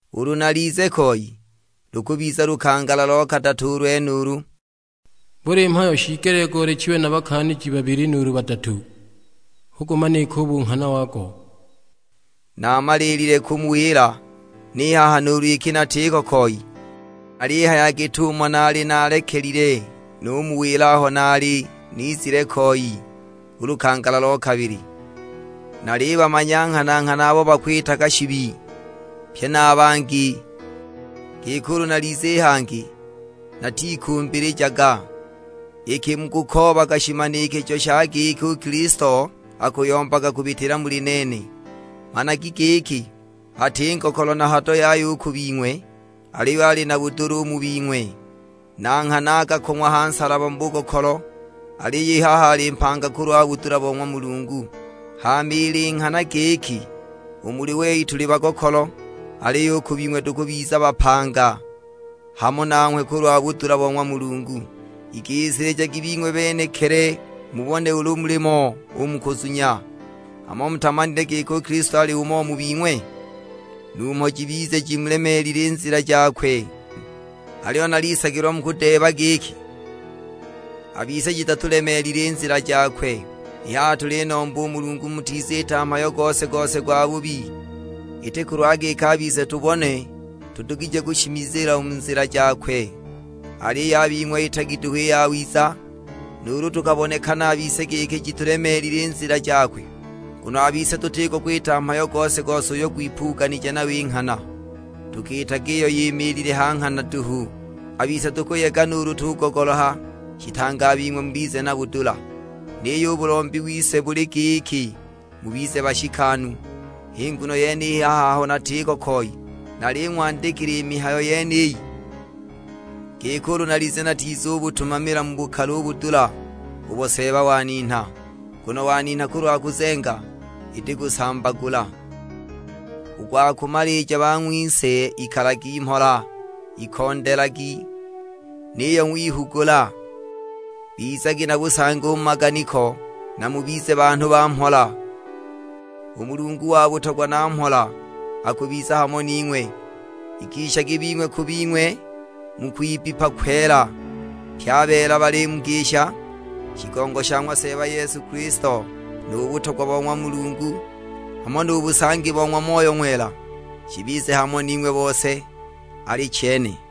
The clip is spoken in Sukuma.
Ulu nalize koi, lukubiza lukangala lo kadatu u lwenulu; buli mhayo shiigelile goolechiwe na bakaaniji babili nuulu badatu, hu gumanike u bunghana wago. Naamalile kumuwila, ni haha nuulu iki natiko koi, nalihaya git'umo naali naalekile numuwila aho naali nizile koi u lukangala lo kabili; nalibamanya nghana-nghana abo bakwitaga shibi, pye na a bangi, giki ulu nalize i hangi, natikumbilijaga. Iki mukukoobaga shimanikijo sha giki u Kilisto akuyombaga kubitila muli nene, managi giki, ati ngokolo na hado yaya u ku bing'we, aliyo ali na budula u mu bing'we. Na nghana akakong'wa ha nsalaba mu bugokolo, aliyo i haha ali mpanga kulwa budula bo ng'wa Mulungu; hama ili nghana giki u muli wei tuli bagokolo, aliyo u ku bing'we tukubiza bapanga hamo nanghwe kulwa budula bo ng'wa Mulungu. Igisilijagi bing'we benekili mubone ulu mulimo u mu kuzunya; hamo mutamanile giki u Kilisto alimo u mu bing'we? Numho jibize jimulemeelile i nzila jakwe! Aliyo nalisagilwa mukudeeba giki, a bise jitatulemeelile i nzila jakwe. I haha tulinomba u Mulungu mutiziita mhayo gose-gose gwabubi; iti kulwa giki a bise tubonwe tudugije kushimizila u mu nzila jakwe, aliyo a bing'we itagi duhu i yawiza, nuulu tukabonekana a bise giki jitulemeelile i nzila jakwe! Nguno a bise tutiko kwita mhayo gose-gose uyo gwipuganije nayo i nghana, tukiitaga iyo yimiilile ha nghana duhu. A bise tukuyega nuulu tugogoloha, shitange a bing'we mubize na budula; niyo u bulombi wise buli giki mubize bashikanu. H'i nguno yene i haha aho natiko koi naling'wandikila i mihayo yeniyi, giki ulu nalize natizubutumamila mu bukali u budula ubo Seeba waninha; nguno waninha kulwa kuzenga, iti kusambagula. U gwa kumalija bang'wise ikalagi mhola, ikondelagi, niyo ng'wihugula; bizagi na busangi u mu maganiko, na mubize banhu ba mhola. U Mulungu wa butogwa na mhola akubiza hamo ning'we. Igishagi bing'we ku bing'we mu kwibbipa kwela. Pye a beela balimugisha. Shigongo sha ng'wa Seeba Yesu Kilisto, nu butogwa bo ng'wa Mulungu, hamo nu busangi bo ng'wa Moyo Ng'wela, shibize hamo ning'we bose: Alichene.